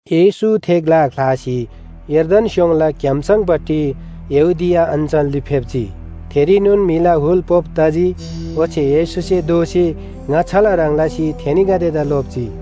येशू थे ग्‍ला ख्‍लासी यर्दन स्‍योङला क्‍याम्‍सङपट्टि यहूदिया अञ्‍चलरी फेप्‍जी। थेरीनोन म्‍हिला हुल पोप तजी, ओच्‍छे येशूसे दोःसी ङाच्‍छाला ह्रङ् लसी थेनीगदेदा लोप्‍जी।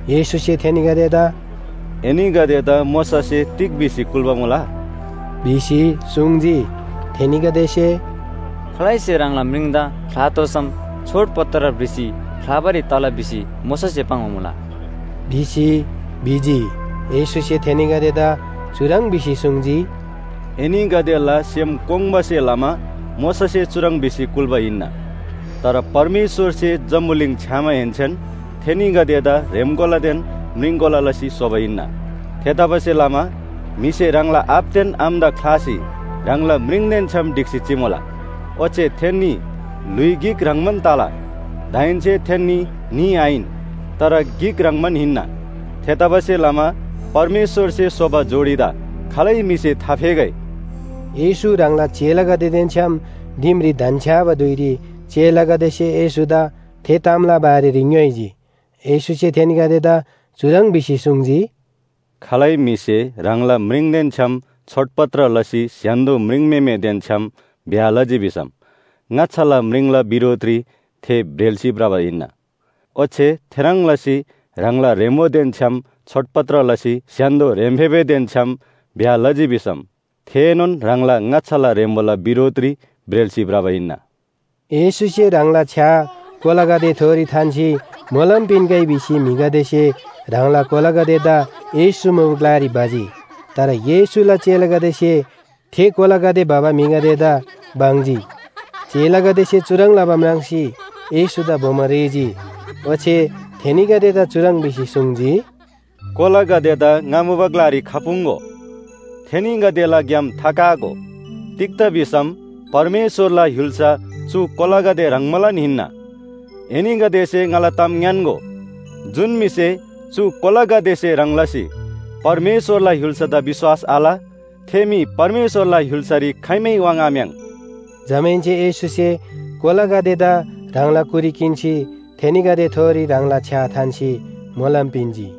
येशूसे थेनीगदेदा “एनीगदेदा मोशासे तिग भिसी कुल्‍बा मुला?” भिसी सुङ्जी। थेनीगदेसे, “खालैसे ह्राङला म्रिङदा ख्‍लातोःसम छोडपत्र भ्रिसी ख्‍लाबारी तला भिसी मोशासे पाङ्बा मुला” भिसी भिजी। येशूसे थेनीगदेदा चुह्रङ् भिसी सुङ्जी, “एनीगदेला सेम कोङ्बासे लमा मोशासे चुह्रङ् भिसी कुल्‍बा हिन्‍ना। तर परमेश्‍वरसे जम्‍बुलिङ छ्‌यामाहेन्‍सेन थेनीगदेदा ह्रेम्‍कोलादेन म्रिङकोला लसी स्‍होबा हिन्‍ना। ‘थेतबासेलमा म्‍हिसे ह्राङला आबादेन आमादा ख्‍लासी ह्राङला म्रिङदेन छ्‌याम ढिक्‍सी चिमुला। ओच्‍छे थेन्‍नी ल्‍हुइ गिक ह्रङ्‌बान तला’ दाहेन्‍से थेन्‍नी न्‍ही आहिन, तर गिक ह्रङ्‌बान हिन्‍ना। थेतबासेलमा परमेश्‍वरसे स्‍होबा जोडीदा खालै म्‍हिसे थाफेगै।” येशू ह्राङला चेलागदेदेन छ्‌याम दिमरी धन्‍छ्‌याबा धुइरी चेलागदेसे येशूदा थे तामला बारेरी ङ्‌योइजी। येशूसे थेनीगदेदा चुह्रङ् भिसी सुङ्जी, “खालै म्‍हिसे ह्राङला म्रिङदेन छ्‌याम छोडपत्र लसी स्‍य्‍हान्‍दो म्रिङम्‍हेमेदेन छ्‌याम ब्‍याह लजी भिसम ङाच्‍छाला म्रिङला बिरोधरी थे ब्रेल्‍सी भ्रबा हिन्‍ना। ओच्‍छे थेह्रङ् लसी ह्राङला ह्रेम्‍बोदेन छ्‌याम छोडपत्र लसी स्‍य्‍हान्‍दो ह्रेम्‍फेबेदेन छ्‌याम ब्‍याह लजी भिसम थेएनोन ह्राङला ङाच्‍छाला ह्रेम्‍बोला बिरोधरी ब्रेल्‍सी भ्रबा हिन्‍ना।” येशूसे ह्राङला छ्‌या कोलागदेथोरी थान्‍सी मोलम पिन्‍गै भिसी म्‍हिगदेसे ह्राङला कोलागदेदा येशू मुबा ग्‍लारी भजी। तर येशूला चेलागदेसे थे कोलागदे भबा म्‍हिगदेदा बङ्जी। चेलागदेसे चुह्रङ् लबा म्राङ्सी येशूदा बोमो रेःजी। ओच्‍छे थेनीगदेदा चुह्रङ् भिसी सुङ्जी, “कोलागदेदा ङा मुबा ग्‍लारी खपुङ्‍गो, थेनीगदेला ग्‍याम थाकागो। तिग्‍दा भिसम परमेश्‍वरला य्‍हुल्‍सा चु कोलागदे ह्रङ्बालान हिन्‍ना। एनीगदेसे ङाला ताम ङ्‌यान्‍गो, जुन म्‍हिसे चु कोलागदेसे ह्रङ् लसी परमेश्‍वरला य्‍हुल्‍सादा विश्‍वास आल थे म्‍हि परमेश्‍वरला य्‍हुल्‍सारी खाइमै वाङ्‌आम्‍याङ्। जमाहेन्‍से येशूसे कोलागदेदा ह्राङला कुरी किन्‍सी थेनीगदेथोरी ह्राङला छ्‌या थान्‍सी मोलम पिन्‍जी।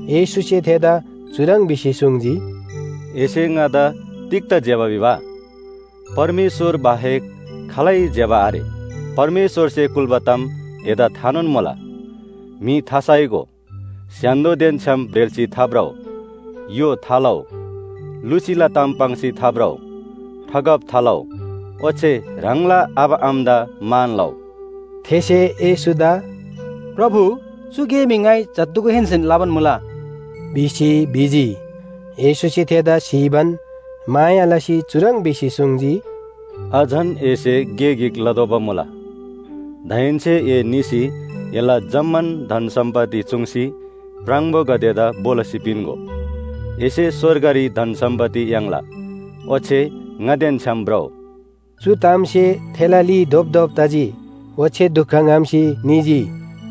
येशूसे थेदा चुह्रङ् भिसी सुङ्जी, “एसे ङादा तिग्‍दा ज्‍यबा भिबा? परमेश्‍वर बाहेक खालै ज्‍यबा आरे। परमेश्‍वरसे कुल्‍बा ताम एदा थानोन मुला। म्‍हि थासाइगो, स्‍य्‍हान्‍दोदेन छ्‌याम ब्रेल्‍सी थाभ्रउ, य्‍हो थालउ, लुसीला ताम पाङ्सी थाभ्रउ, ठगब थालउ, ओच्‍छे ह्राङला आबा आमादा मान लउ।” थेसे येशूदा “प्रभु, चु गे मी ङाइ जत्‍धुगुहेन्‍सेन लबान मुला” भिसी भिजी। येशूसे थेदा स्‍हीबान माया लसी चुह्रङ् भिसी सुङ्जी, “अझन एसे गे गिक लतोःबा मुला। दाहेन्‍से ए निसी एला जम्‍मान धन सम्‍पत्ति चूङ्सी प्राङबोगदेदा भो लसी पिन्‍गो। एसे स्‍वर्गरी धन सम्‍पत्ति याङ्ला, ओच्‍छे ङादेन छ्‌याम भ्रउ।” चु तामसे थेला ली धोपधोप तजी। ओच्‍छे दुख ङ्‍हम्‍सी निजी।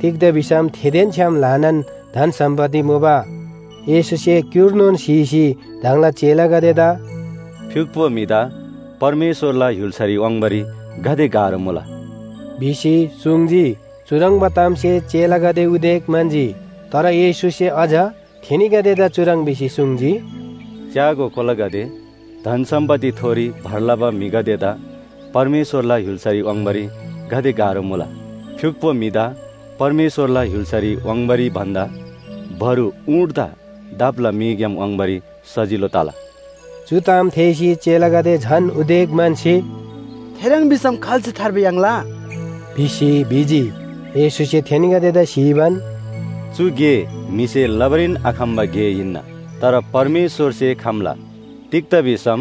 तिग्‍दा भिसम थेदेन छ्‌याम ल्‍हानान धन सम्‍पत्ति मुबा। येशूसे क्‍युर्नोन स्‍हीसी ह्राङला चेलागदेदा “फ्‍युक्‍पो म्‍हिदा परमेश्‍वरला य्‍हुल्‍सारी वाङ्बारी गाते गाह्रो मुला” भिसी सुङ्जी। चुह्रङ्बा तामसे चेलागदे उदेक म्‍हन्‍जी। तर येशूसे अझ थेनीगदेदा चुह्रङ् भिसी सुङ्जी, “च्‍यागो कोलागदे, धन सम्‍पत्तिथोरी भर लबा म्‍हिगदेदा परमेश्‍वरला य्‍हुल्‍सारी वाङ्बारी गाते गाह्रो मुला? फ्‍युक्‍पो म्‍हिदा परमेश्‍वरला य्‍हुल्‍सारी वाङ्बारी भन्‍दा बरु ऊँटदा दापला मीग्‍याम वाङ्बारी सजिलो तला।” चु ताम थेःसी चेलागदे झन उदेक म्‍हन्‍सी, “थेह्रङ् भिसम खाल्‍से थार्बा याङ्ला?” भिसी भिजी। येशूसे थेनीगदेदा स्‍हीबान, “चु गे म्‍हिसे लबारीन आखम्‍बा गे हिन्‍ना, तर परमेश्‍वरसे खम्‍ला, तिग्‍दा भिसम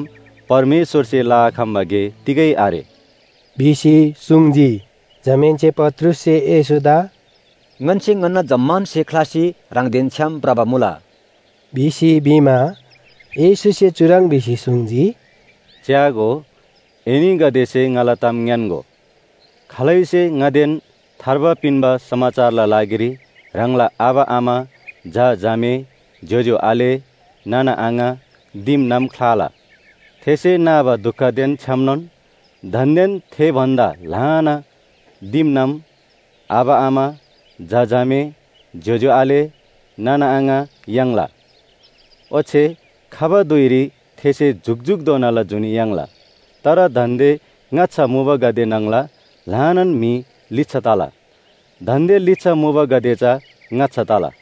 परमेश्‍वरसे लआखम्‍बा गे तिगै आरे” भिसी सुङ्जी। जमाहेन्‍से पत्रुससे येशूदा “ङन्‍से ङन्‍ना जम्‍मान स्‍हे ख्‍लासी ह्राङदेन छ्‌याम भ्रबा मुला” भिसी भिमा, येशूसे चुह्रङ् भिसी सुङ्जी, “च्‍यागो, एनीगदेसे ङाला ताम ङ्‌यान्‍गो, खालैसे ङादेन थार्बा पिन्‍बा समाचारला लागिरी ह्राङला आबा आमा, झा झामे, ज्‍योज्‍यो आले, नाना आङा, दिमनाम ख्‍लाला, थेसे नाबा दुखदेन छ्‌यामनोन दान्‍देन थे भन्‍दा ल्‍हाना दिमनाम, आबा आमा, झा झामे, ज्‍योज्‍यो आले, नाना आङा याङ्ला। ओच्‍छे खबा धुइरी थेसे जुकजुकधोनाला जुनी याङ्ला। तर दान्‍दे ङाच्‍छा मुबागदे न्‍हङला ल्‍हानान म्‍हि लिच्‍छा तला, दान्‍दे लिच्‍छा मुबागदे चा ङाच्‍छा तला।”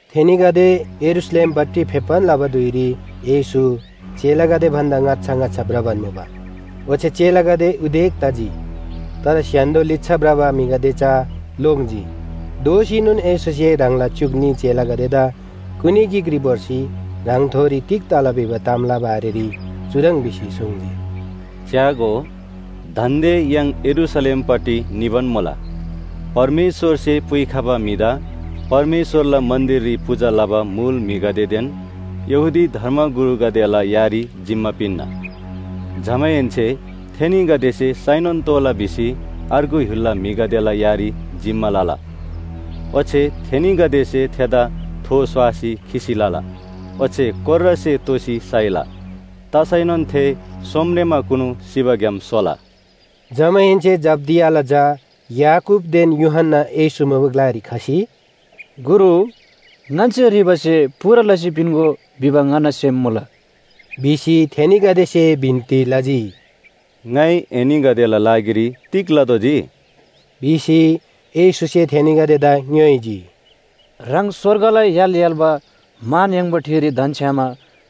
थेनीगदे यरूशलेमपट्टि फेप्‍बान लबा धुइरी येशू चेलागदे भन्‍दा ङाच्‍छा ङाच्‍छा भ्रबान मुबा। ओच्‍छे चेलागदे उदेक तजी, तर स्‍य्‍हान्‍दो लिच्‍छा भ्रबा म्‍हिगदे चा लोङ्जी। दोःसीनोन येशूसे ह्राङला च्‍युक न्‍ही चेलागदेदा कुनी गिकरी भोर्सी ह्राङथोरी तिग तला भिबा तामला बारेरी चुह्रङ् भिसी सुङ्जी। “च्‍यागो, दान्‍दे य्‍हाङ यरूशलेमपट्टि निबान मुला। परमेश्‍वरसे पुइखबा म्‍हिदा परमेश्‍वरला मन्‍दिररी पूजा लबा मुल म्‍हिगदेदेन यहूदी धर्मगुरुगदेला यारी जिम्‍मा पिन्‍ना। जमाहेन्‍से थेनीगदेसे साइनोन तोःला भिसी अर्गु य्‍हुलला म्‍हिगदेला यारी जिम्‍मा लला। ओच्‍छे थेनीगदेसे थेदा थो स्‍वासी खिसी लला ओच्‍छे कोर्रासे तोसी साइला। तसैनोन थे सोमरेमाकुनु सिबाग्‍याम सोला।” जमाहेन्‍से जब्‍दियाला झा याकूबदेन यूहन्‍ना येशू मुबा ग्‍लारी खसी, “गुरु, ङन्‍से ह्रीबा स्‍हे पूरा लसी पिन्‍गो भिबा ङन्‍ना सेम मुला” भिसी थेनीगदेसे बिन्‍ती लजी। “ङाइ एनीगदेला लागिरी तिग लतोःजी?” भिसी येशूसे थेनीगदेदा ङ्‌योइजी। “ह्राङ स्‍वर्गला य्‍हाल य्‍हाल्‍बा मान याङ्बा ठिरी धन्‍छ्‌यामा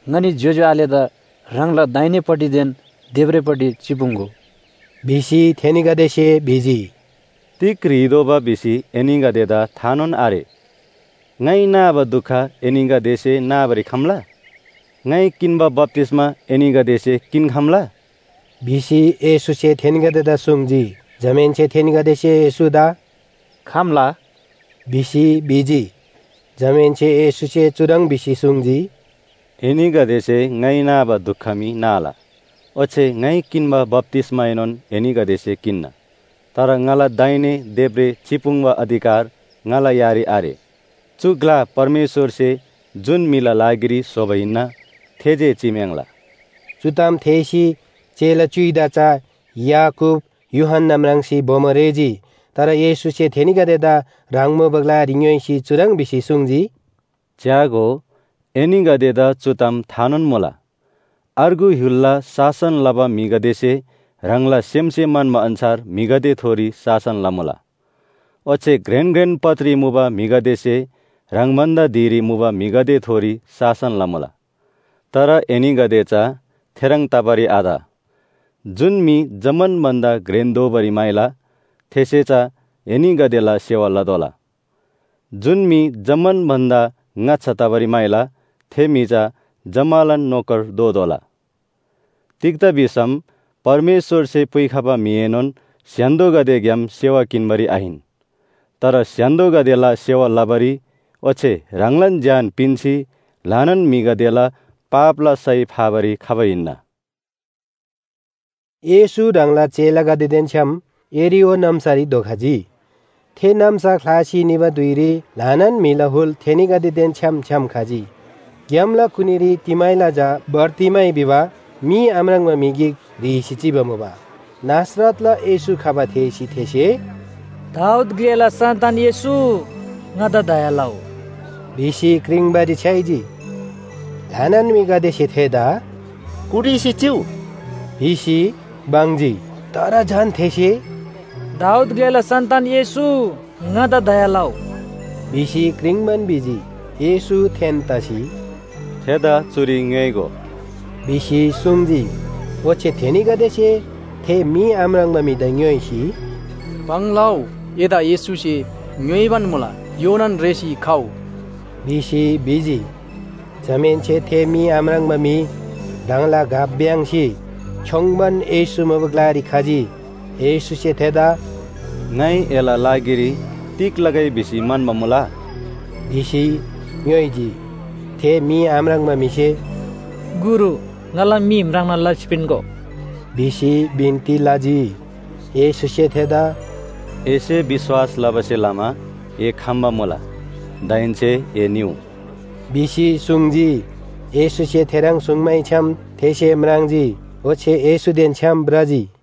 ङनी ज्‍योज्‍यो आलेदा ह्राङला दाहिनेपट्टिदेन देब्रेपट्टि चिपुङ्‍गो” भिसी थेनीगदेसे भिजी। “तिग ह्रीदोबा भिसी एनीगदेदा थानोन आरे। ङाइ नाबा दुख एनीगदेसे नाबारी खम्‍ला? ङाइ किन्‍बा बप्‍तिस्‍मा एनीगदेसे किन्‍खम्‍ला?” भिसी येशूसे थेनीगदेदा सुङ्जी। जमाहेन्‍से थेनीगदेसे येशूदा “खम्‍ला” भिसी भिजी। जमाहेन्‍से येशूसे चुह्रङ् भिसी सुङ्जी, “एनीगदेसे ङाइ नाबा दुख मी नाला, ओच्‍छे ङाइ किन्‍बा बप्‍तिस्‍माएनोन एनीगदेसे किन्‍ना। तर ङाला दाहिने देब्रे चिपुङ्बा अधिकार ङाला यारी आरे। चु ग्‍ला परमेश्‍वरसे जुन म्‍हिला लागिरी स्‍होबा हिन्‍ना थे जे चिम्‍याङ्ला।” चु ताम थेःसी चेला च्‍युइदा चा याकूब, यूहन्‍ना म्राङ्सी बोमो रेःजी। तर येशूसे थेनीगदेदा ह्राङ मुबा ग्‍लारी ङ्‌योइसी चुह्रङ् भिसी सुङ्जी, “च्‍यागो, एनीगदेदा चु ताम थानोन मुला, अर्गु य्‍हुलला शासन लबा म्‍हिगदेसे ह्राङला सेमसे म्‍हन्‍बा अन्‍छार म्‍हिगदेथोरी शासन लमुला। ओच्‍छे घ्रेन घ्रेन पदरी मुबा म्‍हिगदेसे ह्राङ भन्‍दा धिरी मुबा म्‍हिगदेथोरी शासन लमुला। तर एनीगदे चा थेह्रङ् तबारी आत। जुन म्‍हि जम्‍मान भन्‍दा घ्रेन दोबारी म्‍हाइला थेसे चा एनीगदेला सेवा लतोःला। जुन म्‍हि जम्‍मान भन्‍दा ङाच्‍छा तबारी म्‍हाइला थे म्‍हि चा जम्‍मालान नोकर दोतोःला। तिग्‍दा भिसम परमेश्‍वरसे पुइखबा म्‍हिएनोन स्‍य्‍हान्‍दोगदेग्‍याम सेवा किन्‍बारी आहिन, तर स्‍य्‍हान्‍दोगदेला सेवा लबारी ओच्‍छे ह्राङलान ज्‍यान पिन्‍सी ल्‍हानान म्‍हिगदेला पापला सय फाबारी खबा हिन्‍ना” भिसी सुङ्जी। येशू ह्राङला चेलागदेदेन छ्‌याम यरीहो नाम्‍सारी धोखजी। थे नाम्‍सा ख्‍लासी निबा धुइरी ल्‍हानान म्‍हिला हुल थेनीगदेदेन छ्‌याम छ्‌याम खजी। ग्‍यामला कुनीरी तिमैला झा बारतिमै भिबा मी आम्राङ्बा म्‍हि गिक ह्रीसी चिबा मुबा। नासरतला येशू खबा थेःसी थेसे “दाऊद ग्‍लेला सन्‍तान येशू, ङादा दया लउ!” भिसी क्रिङ्बारी छ्‌याइजी। ल्‍हानान म्‍हिगदेसे थेदा “कुटिसी चिउ” भिसी बङ्जी। तर झन थेसे “दाऊद ग्‍लेला सन्‍तान येशू, ङादा दया लउ!” भिसी क्रिङ्बान भिजी। येशू थेन तसी, “थेदा चुरी ङ्‍योइगो!” भिसी सुङ्जी। ओच्‍छे थेनीगदेसे थे मी आम्राङ्बा म्‍हिदा ङ्‌योइसी, “भङ लउ, एदा येशूसे ङ्‍योइबान मुला, योनान रेःसी खउ।” भिसी भिजी। जमाहेन्‍से थे मी आम्राङ्बा म्‍हि ह्राङला घ भ्‍याङ्‍सी छ्‌योङ्बान येशू मुबा ग्‍लारी खजी। येशूसे थेदा “ङाइ एला लागिरी तिग लगै भिसी म्‍हन्‍बा मुला?” भिसी ङ्‌योइजी, थे मी आम्राङ्बा म्‍हिसे “गुरु, ङाला मी म्राङ्ना लसी पिन्‍गो” भिसी बिन्‍ती लजी। येशूसे थेदा “एसे विश्‍वास लबासे लमा ए खम्‍बा मुला। दाहेन्‍से ए निउ” भिसी सुङ्जी। येशूसे थेह्रङ् सुङ्मैछ्‌याम थेसे म्राङ्जी ओच्‍छे येशूदेन छ्‌याम भ्रजी।